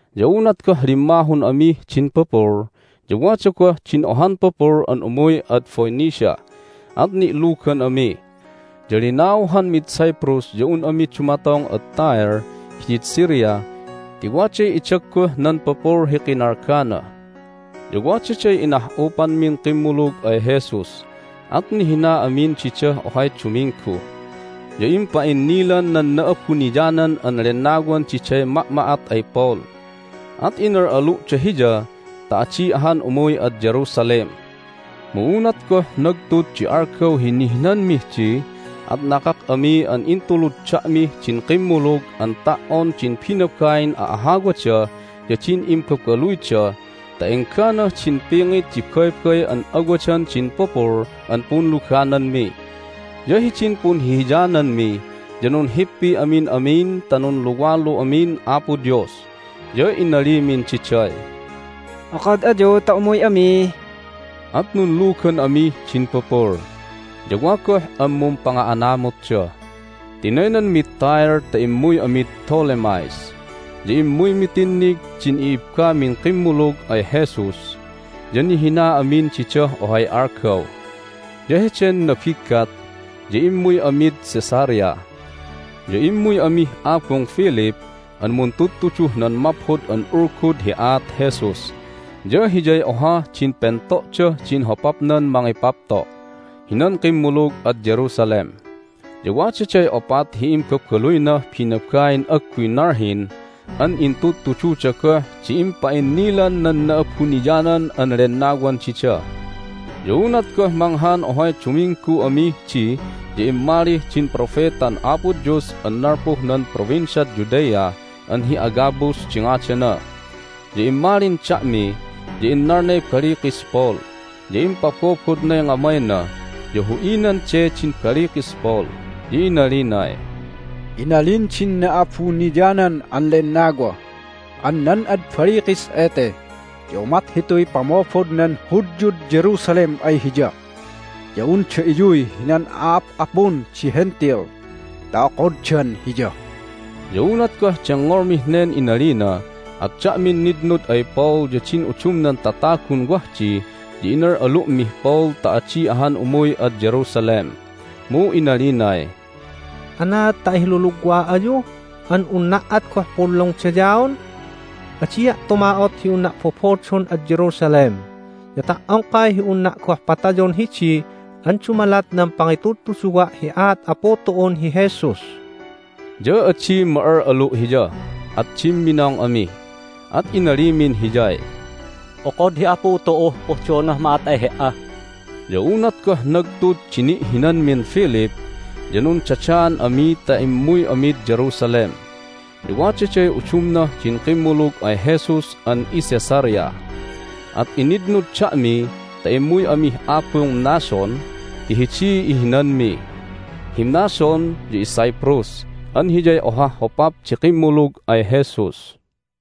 Ya unat goh limmahun amih din pupul ya wada goh din ohan pupul an umuy ad Phoenicia, at ni'lugan ami. Ya linauhanmid Cyprus ya un ami dumatong ad Tyre hidid Syria ti waday idagguh nan pupul hi kinalgana. Ya wadaday inah'upanmin kimmulug ay Jesus, at nihina amin didah ohay duminggu. Ya impa'innilan nan Na'abuniyanan an Lennawan diday ma'ma'at ay Paul, at inal'alu'da hiya ta adi ahan umuy ad Jerusalem. Mu unat goh nagtud di algaw hi nihinanmih di at nakak ami an intulud da'mih din kimmulug an ta"on din binabain a'ahawada ya din imbabaluyda ta engganah din pingit di baybay an awadan din pupul an punlugananmi. Ya hidin punhihiyananmi ya nunhippi amin amin ta nunluwalu amin Apo Dios. Ya inalimin diday, "Okod ayu ta umuy ami!" At nunlugan amih din pupul, ya wa goh an mumpanga'anamutda. Tinaynanmid Tyre ta immuy amid Ptolemais. Ya immuymi tinnig din i'ibbamin kimmulug ay Jesus, ya nihina amin didah ohay algaw. Ya heden nabiggat ya immuy amid Caesarea. Ya immuy amih abung Philip an muntudtuduh nan Maphod an Ulgud hi aat Jesus, ya hiyay ohah din pento'dah din hopapnan mangipapto' hinan kimmulug ad Jerusalem. Ya wadaday opat hi imbabaluynah binabain agguy nalhin an intudtududa goh di impa'innilan nan Na'abuniyanan an Lennawan dida. Ya unat goh manghan ohay duminggu amih di ya immali din propetan Apo Dios an nalpuh nan Provinciad Judea an hi Agabus di ngadana. Ya immalin da'mi, ya innalnay balikis Paul, ya impabobodnay ngamayna ya hu'inan de din balikis Paul, ya inalinay, "Inalin din Na'abuniyanan an Lennawa an nan ad balikis ete ya umat hituy pamobod nan Hudyud Jerusalem ay hiya ya unda iyuy hinan a'ap'apun di Hentil ta okoddan hiya." Ya unat goh dengngolmih nen inalina at da'min nitnud ay Paul ya din udumnan tatagun wah di ya inal'alu'mih Paul ta adi ahan umuy ad Jerusalem. Mu inalinay, "Anaad ta ahilulugwa ayu an unna' at goh punlungdayaon? Adia' tuma'ot hi unna' bobodon ad Jerusalem, ya ta"ongkay hi unna' goh patayon hidi an dumalat nan pangitudtuduwa' hi aat Apu tu'un hi Jesus!" Ya adi ma'al'alu' hiya, at dimminong ami, at inalimin hiyay, "Okod hi Apu tu'uh pohdonah ma'at ay he"a." Ya unat goh nagtud di ni'hinanmin Philip ya nundadaan ami ta immuy amid Jerusalem. Ya wadaday udumnah din kimmulug ay Jesus an iCaesarea, at initnud da'mi ta immuy amih abung Mnason ti hidiy ihinanmi. Hi Mnason ya iCyprus an hiyay ohah hopap di kimmulug ay Jesus.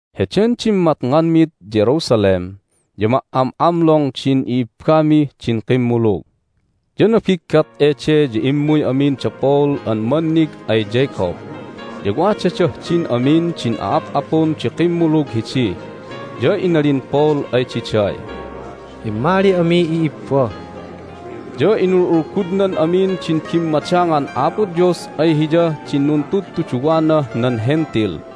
Heden dimmatnganmid Jerusalem ya ma"am'amlong din i'ibbamih din kimmulug. Ya nabiggat ede ya immuy amin da Paul an mannig ay Jacob. Ya wadadah din amin din a'ap'apun di kimmulug hidi. Ya inalin Paul ay diday, "Immali ami, i'ibba!" Ya inul'ulgudnan amin din bimmadangan Apo Dios ay hiyah din nuntudtuduwanah nan Hentil.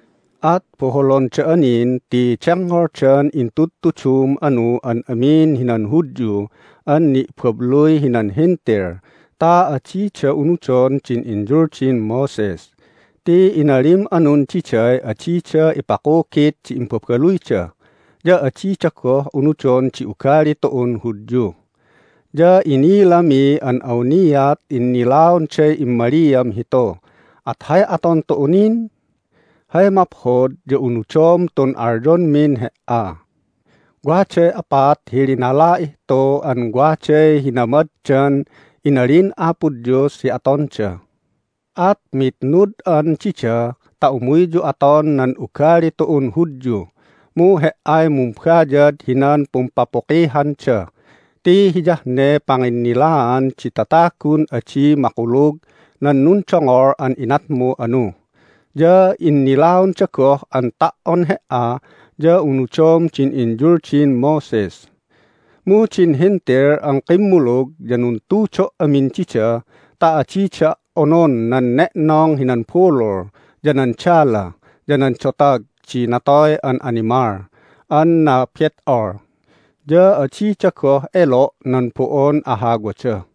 At boholon da'a nin ti dengngoldan intudtudum anu an amin hinan Hudyu an ni'babluy hinan Hentil ta adida unudon din inyuldin Moses, ti inalim anun diday adida ipakugit di imbabaluyda, ya adida goh unudon di ugali tu'un Hudyu. Ya inilami an awniat innilaonday immaliam hitu, at hay aton tu'u nin? Hay maphod ya unudom tun alyonmin he"a. Waday opat hi linala'ih tu an waday hinamaddan inalin Apo Dios hi atonda. At mitnud'an dida ta umuyyu aton nan ugali tu'un Hudyu, mu he"ay mumbayad hinan pumpapukihanda ti hiyah ne panginnilaan di tatagun adi makulug nan nundongol an inatmu anu, ya innilaonda goh an ta"on he"a ya unudom din inyuldin Moses. Mu din Hentil an kimmulug ya nuntudo' amin dida ta adida onon nan ne'nong hinan bulul, ya nan dala, ya nan dotag di natoy an animal an nabet'ol, ya adida goh elo' nan bo'on ahawada."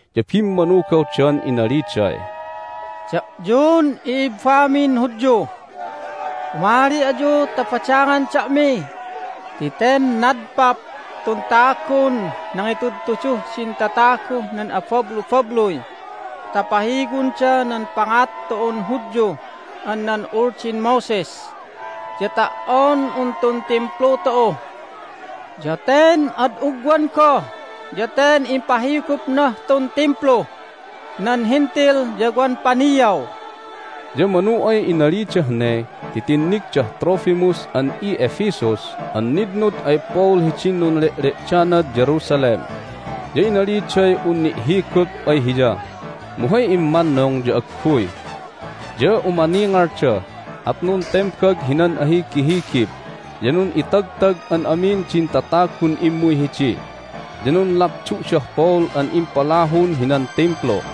Ya bimmanugawdan inaliday, "Da'yun i'ibbamin Hudyu, umali ayu ta badangan da'mi ti ten nadpap tun tagun nangitudtuduh din tataguh nan abablubabluy ta pahiwonda nan pangat tu'un Hudyu an nan Uldin Moses ya ta"on un tun Timplu tu'u! Ya ten ad ugwan goh ya ten impahigupnah tun Timplu nan Hentil ya wan paniaw!" Ya manu ay inalidah ne ti tinnigdah Trophimus an i'Ephesus an nitnud ay Paul hidin nunle'le'danad Jerusalem, ya inaliday un ni'higup ay hiya, mu hay immannung ya agguy. Ya umaningalda, at nuntembag hinan ahigihigib, ya nun'itagtag an amin din tatagun immuy hidi. Ya nunlapdu'dah Paul an impalahun hinan Timplu.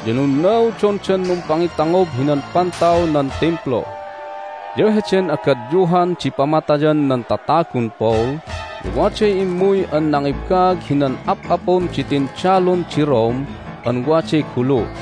Ya nunnaudondan numpangitangob hinan pantaw nan Timplu. Ya heden agadyuhan di pamatayan nan tatagun Paul ya waday immuy an nangibaag hinan ap'apun di tindalun di Rome an waday gulu.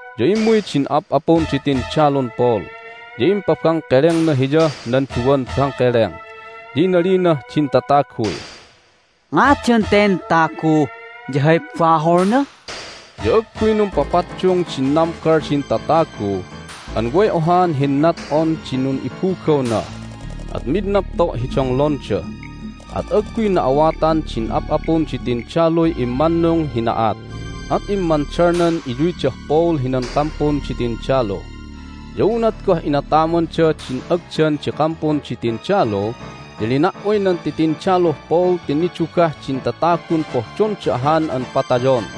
Ya immuy din ap'apun di tindalun Paul, ya impabangkelengna hiyah nan duwan bangkeleng. Ya inalinah din tataguy, "Ngadan ten tagu, ya hay baholna?" Ya agguy numpapaddung din nambal din tatagu an way ohaan hinnat'on di nun'ibugawna, at mid napto' hi donglonda. At agguy na'awatan din ap'apun di tindaluy immannung hi na'at, at immandalnan iyuydah Paul hinan kampun di tindalu. Ya unat goh inatamanda din agdan di kampun di tindalu ya lina"uy nan titindaluh Paul ti nidugah din tatagun pohdonda ahan an patayon.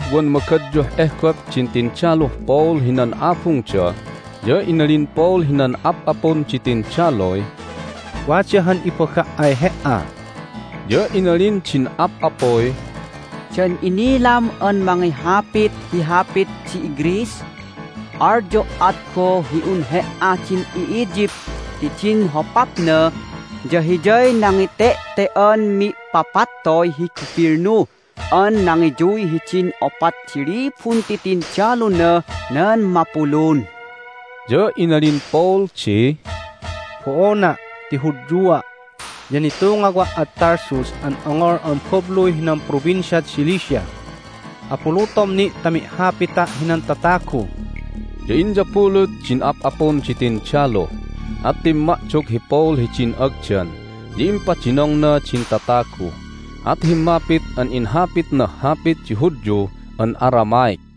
Unat goh wan magadyuh ehgop din tindaluh Paul hinan abungda ya inalin Paul hinan ap'apun di tindaluy, "Wada han ibaga' ay he"a." Ya inalin din ap'apuy, "Dan inilam an mangihapit hi hapit di iGreece? Alyo' at goh hi un he"a din i'Egypt ti din hopapna ya hiyay nangite'te"an mi'papattoy hi gubilnu an nangiyuy hidin opat di libun titindalunah nan mapulun." Ya inalin Paul di, "Bo'ona', ti Hudyua', ya nitungawa' ad Tarsus an ongol an babluy hinan Provinciad Cilicia. Abulutom ni' ta mi'hapita' hinan tatagu." Ya inyabulut din ap'apun di tindalu, at timma'dog hi Paul hidin agdan, ya impadinongna din tatagu, at himmapit an inhapitnah hapit di Hudyu an Aramaic.